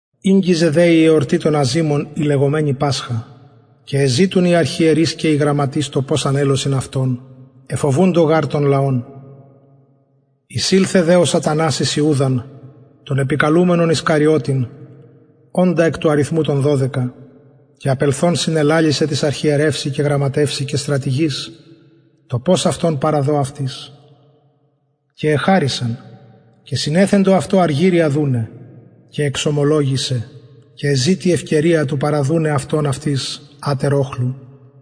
ηγγιζεν δε η εορτη των αζυμων η λεγομενη πασχα και εζητουν οι αρχιερεις και οι γραμματεις το πως ανελωσιν αυτον εφοβουντο γαρ τον λαον εισηλθεν δε σατανας εις ιουδαν τον επικαλουμενον ισκαριωτην οντα εκ του αριθμου των δωδεκα και απελθων συνελαλησεν τοις αρχιερευσιν και στρατηγοις το πως αυτον παραδω αυτοις και εχαρησαν και συνεθεντο αυτω αργυριον δουναι και εξωμολογησεν και εζητει ευκαιριαν του παραδουναι αυτον αυτοις ατερ οχλου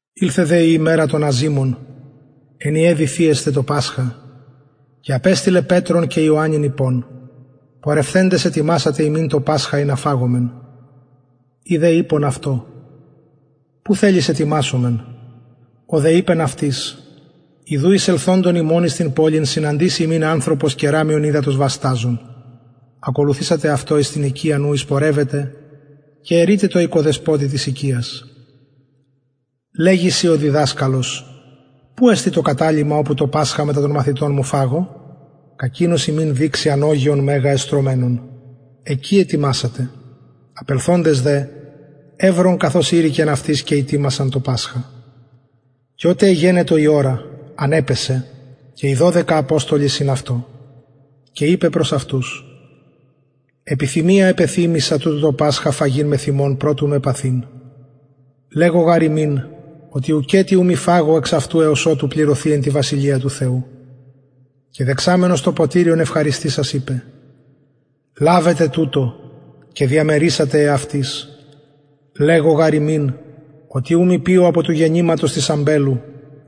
ηλθεν δε η ημερα των αζυμων εν η εδει θυεσθαι το πασχα και απεστειλεν πετρον και ιωαννην ειπων πορευθεντες ετοιμασατε ημιν το πασχα ινα φαγωμεν οι δε ειπον αυτω που θελεις ετοιμασομεν ο δε ειπεν αυτοις ιδου εισελθοντων υμων εις την πολιν συναντησει υμιν ανθρωπος κεραμιον υδατος βασταζων ακολουθησατε αυτω εις την οικιαν ου εισπορευεται και ερειτε τω οικοδεσποτη της οικιας λεγει σοι ο διδασκαλος που εστιν το καταλυμα οπου το πασχα μετα των μαθητων μου φαγω κακεινος υμιν δειξει ανωγεον μεγα εστρωμενον εκει ετοιμασατε απελθοντες δε ευρον καθως ειρηκεν αυτοις και ητοιμασαν το πασχα και οτε εγενετο η ωρα ανεπεσεν και οι δωδεκα αποστολοι συν αυτω και ειπεν προς αυτους επιθυμια επεθυμησα τουτο το πασχα φαγειν μεθ υμων προ του με παθειν λεγω γαρ υμιν οτι ουκετι ου μη φαγω εξ αυτου εως οτου πληρωθη εν τη βασιλεια του θεου και δεξαμενος ποτηριον ευχαριστησας ειπεν λαβετε τουτο και διαμερισατε εαυτοις λεγω γαρ υμιν οτι ου μη πιω απο του γενηματος της αμπελου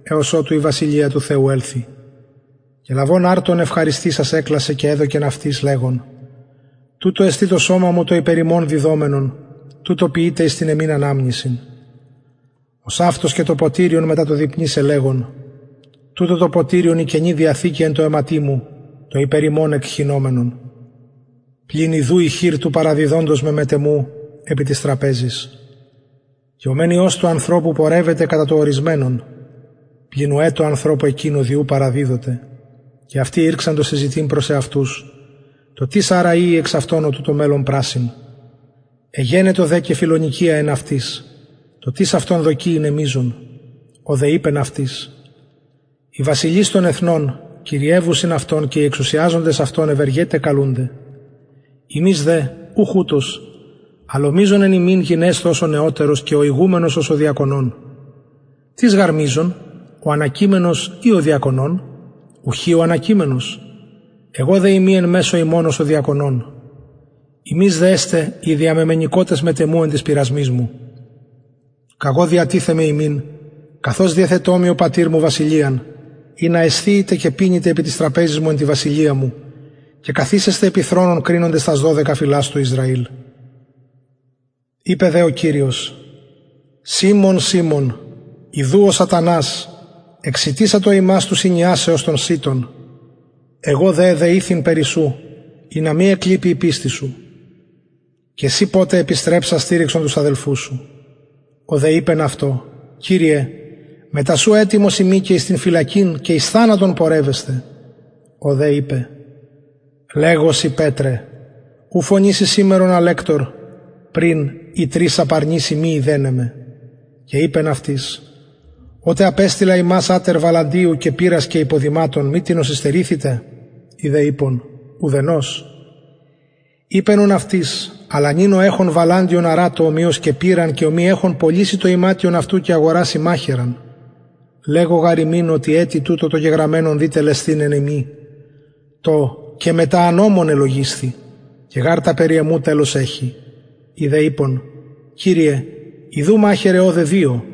εως οτου η βασιλεια του θεου ελθη και λαβων αρτον ευχαριστησας εκλασεν και εδωκεν αυτοις λεγων τουτο εστιν το σωμα μου το υπερ υμων διδομενον τουτο ποιειτε εις την εμην αναμνησιν ωσαυτως και το ποτηριον μετα το δειπνησαι λεγων τουτο το ποτηριον η καινη διαθηκη εν τω αιματι μου το υπερ υμων εκχυνομενον πλην ιδου η χειρ του παραδιδοντος με μετ εμου επι της τραπεζης και ο μεν υιος του ανθρωπου πορευεται κατα το ωρισμενον πλην ουαι τω ανθρωπω εκεινω δι ου παραδιδοται και αυτοι ηρξαντο συζητειν προς εαυτους το τις αρα ειη εξ αυτων ο τουτο μελλων πρασσειν εγενετο δε και φιλονεικια εν αυτοις το τις αυτων δοκει ειναι μειζων ο δε ειπεν αυτοις οι βασιλεις των εθνων κυριευουσιν αυτων και οι εξουσιαζοντες αυτων ευεργεται καλουνται υμεις δε ουχ ουτως αλλ ο μειζων εν υμιν γενεσθω ως ο νεωτερος και ο ηγουμενος ως ο διακονων τις γαρ μειζων ο ανακειμενος η ο διακονων ουχι ο ανακειμενος εγω δε ειμι εν μεσω υμων ως ο διακονων υμεις δε εστε οι διαμεμενηκοτες μετ εμου εν τοις πειρασμοις μου καγω διατιθεμαι υμιν καθως διεθετο μοι ο πατηρ μου βασιλειαν ινα εσθιητε και πινητε επι της τραπεζης μου και καθισεσθε επι θρονων κρινοντες τας δωδεκα φυλας του ισραηλ ειπεν δε ο κυριος σιμων σιμων ιδου ο σατανας εξητησατο υμας του σινιασαι ως τον σιτον εγω δε εδεηθην περι σου ινα μη εκλιπη η πιστις σου και συ ποτε επιστρεψας στηριξον τους αδελφους σου ο δε ειπεν αυτω κυριε μετα σου ετοιμος ειμι και εις φυλακην και εις θανατον πορευεσθαι ο δε ειπεν λεγω σοι πετρε ου μη φωνηση σημερον αλεκτωρ πριν η τρις απαρνηση μη ειδεναι με και ειπεν αυτοις οτε απεστειλα υμας ατερ βαλαντιου και πηρας και υποδηματων μη τινος υστερησατε οι δε ειπον ουθενος ειπεν ουν αυτοις αλλα νυν ο εχων βαλαντιον αρατω ομοιως και πηραν και ο μη εχων πωλησει το ιματιον αυτου και αγορασει μαχαιραν λεγω γαρ υμιν οτι ετι τουτο το γεγραμμενον δει τελεσθηναι εν εμοι το και μετα ανομων ελογισθη και γαρ τα περι εμου τελος εχει οι δε ειπον κυριε ιδου μαχαιραι ωδε δυο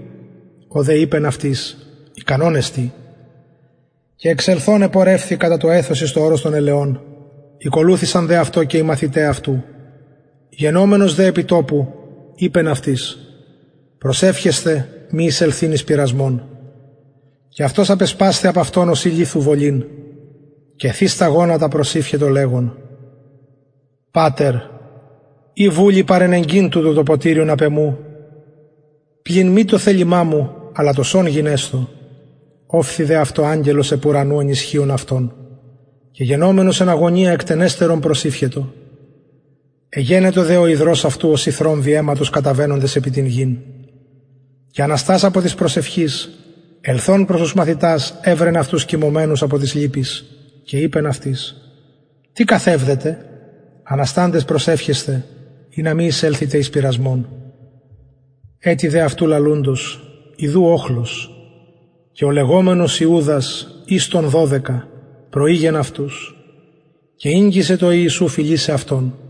ο δε ειπεν αυτοις ικανον εστιν και εξελθων επορευθη κατα το εθος εις το ορος των ελαιων ηκολουθησαν δε αυτω και οι μαθηται αυτου γενομενος δε επι του τοπου ειπεν αυτοις προσευχεσθε μη εισελθειν εις πειρασμον και αυτος απεσπασθη απ αυτων ωσει λιθου βολην και θεις τα γονατα προσηυχετο λεγων πατερ ει βουλει παρενεγκειν το ποτηριον τουτο απ εμου πλην μη το θελημα μου αλλα το σον γενεσθω ωφθη δε αυτω αγγελος απ ουρανου ενισχυων αυτον και γενομενος εν αγωνια εκτενεστερον προσηυχετο εγενετο δε ο ιδρως αυτου ωσει θρομβοι αιματος καταβαινοντες επι την γην και αναστας απο της προσευχης ελθων προς τους μαθητας ευρεν αυτους κοιμωμενους απο της λυπης και ειπεν αυτοις τι καθευδετε ανασταντες προσευχεσθε ινα μη εισελθητε εις πειρασμον ετι δε αυτου λαλουντος ιδου οχλος και ο λεγομενος ιουδας εις των δωδεκα προηρχετο αυτους και ηγγισεν τω ιησου φιλησαι αυτον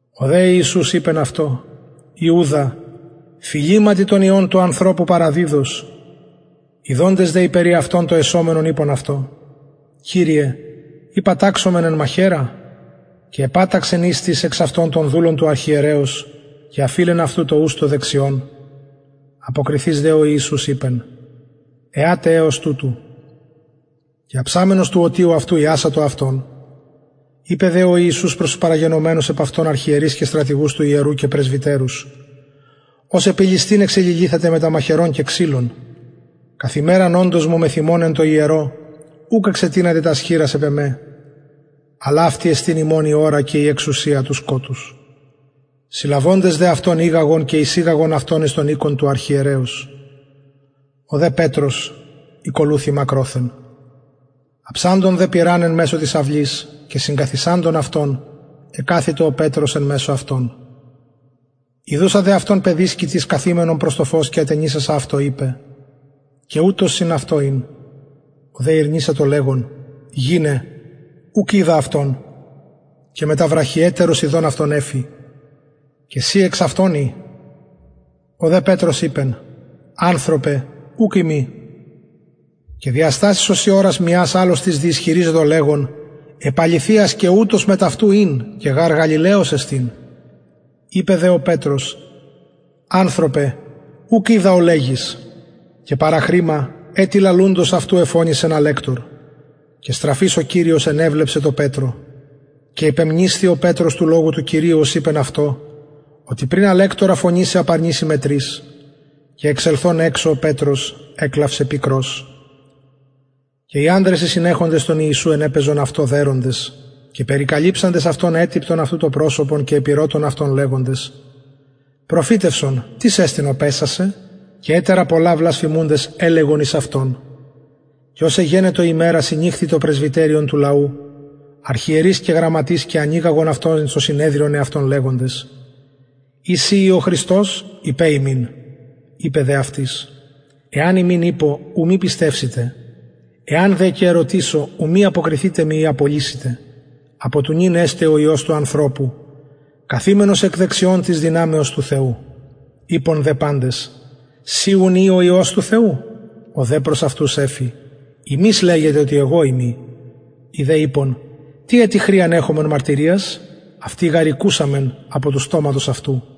ο δε ιησους ειπεν αυτω ιουδα φιληματι τον υιον του ανθρωπου παραδιδως ιδοντες δε οι περι αυτον το εσομενον ειπον αυτω κυριε ει παταξομεν εν μαχαιρα και επαταξεν εις τις εξ αυτων τον δουλον του αρχιερεως και αφειλεν αυτου το ους το δεξιον αποκριθεις δε ο ιησους ειπεν εατε εως τουτου και αψαμενος του ωτιου αυτου ιασατο αυτον ειπεν δε ο ιησους προς τους παραγενομενους επ αυτον αρχιερεις και στρατηγους του ιερου και πρεσβυτερους ως επι ληστην εξεληλυθατε μετα μαχαιρων και ξυλων καθ ημεραν οντος μου μεθ υμων εν τω ιερω ουκ εξετεινατε τας χειρας επ εμε αλλ αυτη υμων εστιν η ωρα και η εξουσια του σκοτους συλλαβοντες δε αυτον ηγαγον και εισηγαγον αυτον εις τον οικον του αρχιερεως ο δε πετρος ηκολουθει μακροθεν αψαντων δε πυρ εν μεσω της αυλης και συγκαθισαντων αυτων εκαθητο ο πετρος εν μεσω αυτων ιδουσα δε αυτον παιδισκη τις καθημενον προς το φως και ατενισασα αυτω ειπεν και ουτος συν αυτω ην ο δε ηρνησατο αυτον λεγων γυναι ουκ οιδα αυτον και μετα βραχυ ετερος ιδων αυτον εφη και συ εξ αυτων ει ο δε πετρος ειπεν ανθρωπε ουκ ειμι και διαστασης ωσει ωρας μιας αλλος τις διισχυριζετο λεγων επ αληθειας και ουτος μετ αυτου ην και γαρ γαλιλαιος εστιν ειπεν δε ο πετρος ανθρωπε ουκ οιδα ο λεγεις και παραχρημα ετι λαλουντος αυτου εφωνησεν αλεκτωρ και στραφεις ο κυριος ενεβλεψεν τω πετρω και υπεμνησθη ο πετρος του λογου του κυριου ως ειπεν αυτω οτι πριν αλεκτορα φωνησαι απαρνηση με τρις και εξελθων εξω ο πετρος εκλαυσεν πικρως και οι ανδρες οι συνεχοντες τον ιησουν ενεπαιζον αυτω δεροντες και περικαλυψαντες αυτον ετυπτον αυτου το προσωπον και επηρωτων αυτον λεγοντες προφητευσον τις εστιν ο παισας σε και ετερα πολλα βλασφημουντες ελεγον εις αυτον και ως εγενετο ημερα συνηχθη το πρεσβυτεριον του λαου αρχιερεις και γραμματεις και ανηγαγον αυτον εις το συνεδριον αυτων λεγοντες ει συ ει ο χριστος ειπε ημιν ειπεν δε αυτοις εαν υμιν ειπω ου μη πιστευσητε εαν δε και ερωτησω ου μη αποκριθητε μοι η απολυσητε απο του νυν εσται ο υιος του ανθρωπου καθημενος εκ δεξιων της δυναμεως του θεου ειπον δε παντες συ ουν ει ο υιος του θεου ο δε προς αυτους εφη υμεις λεγετε οτι εγω ειμι οι δε ειπον τι ετι χρειαν εχομεν μαρτυριας αυτοι γαρ ηκουσαμεν απο του στοματος αυτου